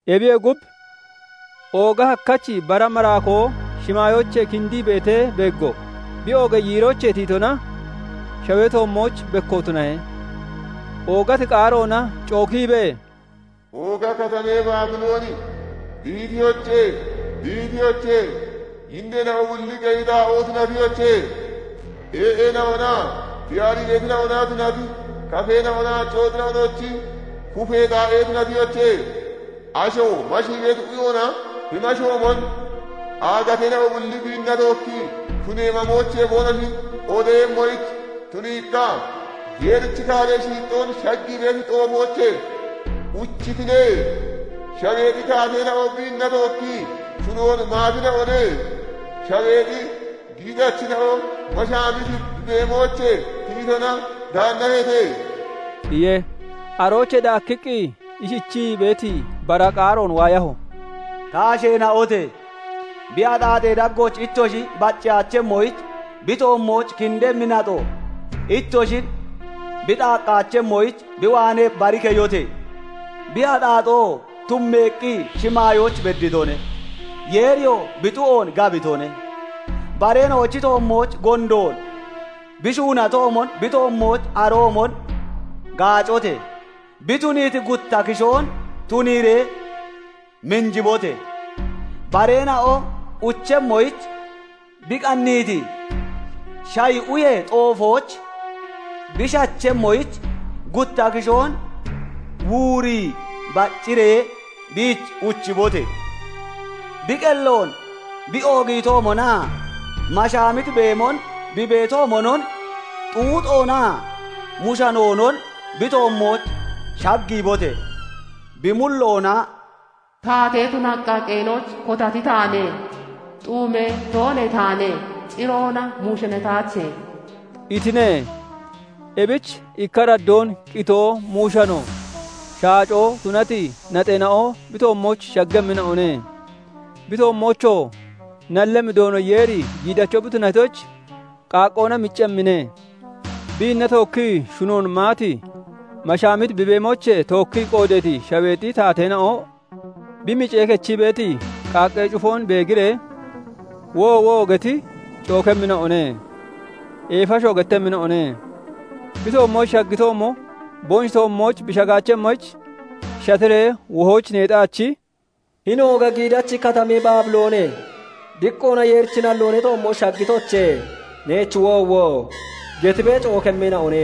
Ebiyee gub, ooga hakkachi bara maraakoo shimaayoochee kindii beetee beeggo; bi oogee yiiroochee tiyitona shawee toommooch bekko tunahe. Oogati qaaroona cookiibee, "Ooga katamee Baabilooni dihitiyoche! Dihitiyoche! Yinneena'o bulli qeyi xaa'oo tunatiyoche! Ee'eena'onaa tiyaariitina'ona tunati kafeena'o[naa cooxina'ono]chi kupee xaa'e tunatiyoche! Asho mashii beeti uyoona bi mashoomon, aagateena'o bulli biinna tookki shunee mamoochee boonoshi qoodeeyemmoyich tuniiqqa, Yeerichi kaaree shiixxoon shaggii beeti xoofoochee uchitine; shaweexi taateena'o biinna tookkii shunoon maatina'one; shaweexi giixachina'o mashaamiti bi beemoochee tiyitona gaannaheete" iye. Aroochee daakkiqqi ishichii beeti bara qaaroon waayaho; "Ta asheena'ote! Bi axaaxee daggooch ittoshi bacceyaachemmoyich, Bi toommooch kindemmi naxoo ittoshin bi xaaqqaachemmoyich, bi waanee bari keyote! Bi axaaxoo tummeeqqi shimaayooch bedditone; Yeeriyoo bi xu'oon gabitone. Bareena'ochi toommooch gondoon bi shuunatoomon, bi toommooch aroomon gaacote! Bi tuniiti gutta kishoon tuniiree minjibote! Bareena'o uchemmoyich bi qanniiti shayi uyee xoofooch bi shachemmoyich, gutta kishoon wuurii bacciree biich uchibote! Bi qelloon bi oogiitoomonaa mashaamiti beemon bi beetoomonon xuuxoonaa muushanoonon bi toommooch shaggiibote! Bi mulloona 'Taatee tunaqqa qeenooch kotati taane; xuumee toonee taane; ciroona muushanataache' itine. Ebich ikka araddoon qitoo, muushano, shaacoo tunati naxeena'o bi toommooch shaggemmina'one; Bi toommoochoo nallemmi Doono Yeeri giidacho bi tunatoyich, qaaqqoona miccemmine. "Biinna tookkii shunoon maati, mashaamiti bi beemoochee tookkii qoodeeti shaweexi taateena'o bi micee kechii beeti qaaqqee cufoon beegiree, 'Woowo!' getti cookemmina'one; eefashoo gettemmina'one. Bi toommooch shaggitoomo boonoshi toommooch bi shagaachemmoyich shatiree wohooch neexaachi, 'Hini ooga giidachi katamee Baabiloone! Diqqoona Yeerichi nalloo ne toommooch shaggitoche! Neech woowo!' gettibee cookemmina'one.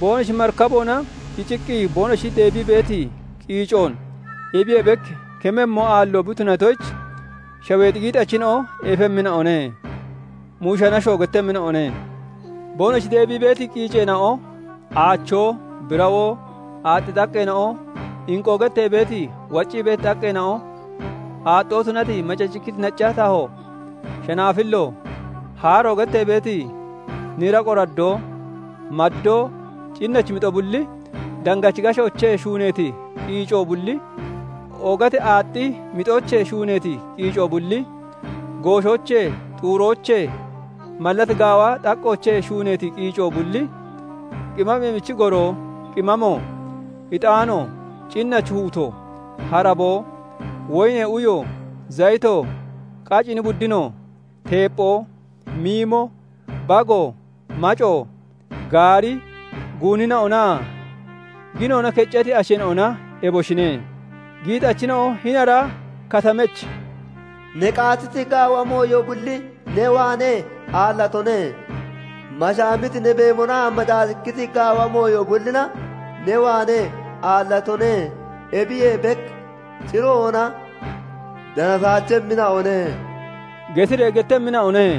"Boonoshi marikaboona kiciqqi boonoshi deebii beeti qiicoon ebiyee bek kememmo aallo bi tunatoyich, shaweexi giixachina'o eefemmina'one; muushanashoo gettemmina'one. Boonoshi deebii beeti qiiceena'o, aachoo, birawoo, aaxxi xaqqeena'o, inqoo gettee beeti, waccii beeti xaqqeena'o, aaxxoo tunati macacikkiti nacca taho, shanaafillo, haaro gettee beeti nira qoraddoo, maddoo, cinnachi mixo bulli, dangachi gashoochee shuuneeti qiico bulli, oogati aaxxi mixoochee shuuneeti qiico bulli, gooshoochee, xuuroochee, mallat gaawa xaqqoochee shuuneeti qiico bulli, qimaamee michi goro, qimaamo, ixaano, cinnachi huuto, haraboo, woyinee uyo, zayito, qacini buddino, teepphoo, miimo, bago, maco, gaari, guunina'onaa ginoona keccati asheena'ona, eboshine. Giixachina'o hini ara katamech 'Ne qaatiti gaawa mooyo bulli ne waanee aallatone; mashaamiti ne beemonaa macacikkiti gaawa mooyo bullina ne waanee aallatina'one; ebiyee bek ciroona danataachemmina'one' getiree gettemmina'one.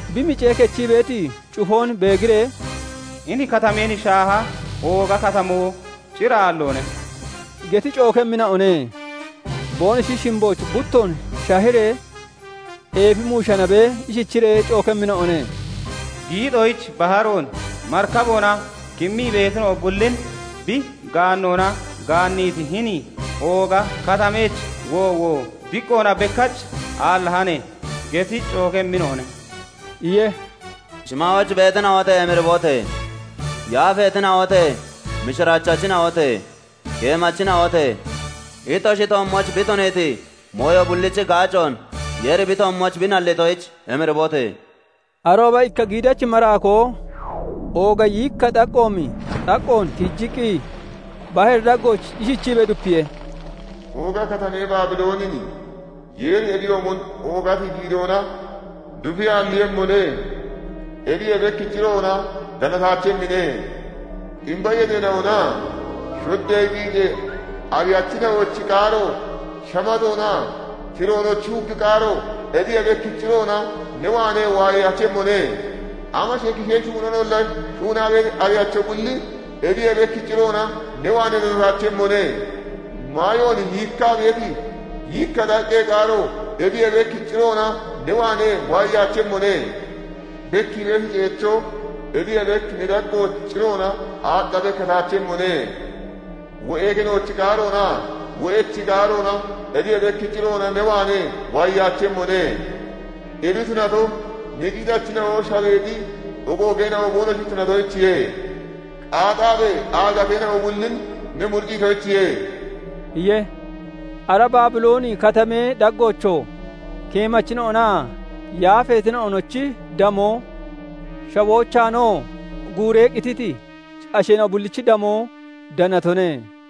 bi micee kechii beeti cufoon beegiree, 'Hini katameen shaaha ooga katamoo cir aalloone!' geti cookemmina'one. Boonoshi shimbooch buttoon shahiree eefi muushanabee ishichiree cookemmina'one:- 'Giixoyich baharoon marikaboona kimmii beetina'o bullin bi gaannoona gaanniiti hini ooga katamech woowo! Diqqoona bekkach aallahane!' geti cookemmina'one" iye. Shimaayooch beetina'ote! Emiribote! Yaafeetina'ote! Mishiraachachina'ote! Keemachina'ote! Ittoshi toommooch bi tuniiti mooyo bullichi gaacoon Yeeri bi toommooch bi nallitoyich emiribote! Arooba ikka giidachi maraakoo ooga yiikka xaqqoomi xaqqoon tiijiqqi baharee daggooch ishichiibee dupiye:- "Ooga katamee Baabiloonin Yeeri ebiyoomon oogati giidoona dufi aalliiyemmone; ebiyee bek ciroona danataachemmine. Ximba yexeena'onaa shoddee qiicee ariyachina'onochi qaaro shamatoonaa tiroonochi huggi qaaro ebiyee bek ciroona ne waanee waayeyaachemmone; amashee kishee shuunoonolla shuunaa beeti ariyacho bulli ebiyee bek ciroona ne waanee danataachemmone; maayoon yiikkaa beeti yiikka xaqqee qaaro ebiyee bek ciroona ne waanee waayeyaachemmone. Bekkii beeti ceechoo ebiyee bek ne daggooch ciroona aaxxa bekkataachemmone; wo'ee kenoochi qaaroonaa wo'echi qaaroona ebiyee bek ciroona ne waanee waayeyaachemmone; ebi tunato, ne giixachina'o shaweexi ogoogeena'o boonoshi tunatoyichiye; iiciibee (qaaxaabee) aagateena'o bullin ne muricciitoyichiye" iye. Ara Baabilooni Katamee daggoochoo keemachina'onaa yaafeetina'onochi damoo, shawoochaanoo guuree qititi asheena'o bullichi damoo danatone.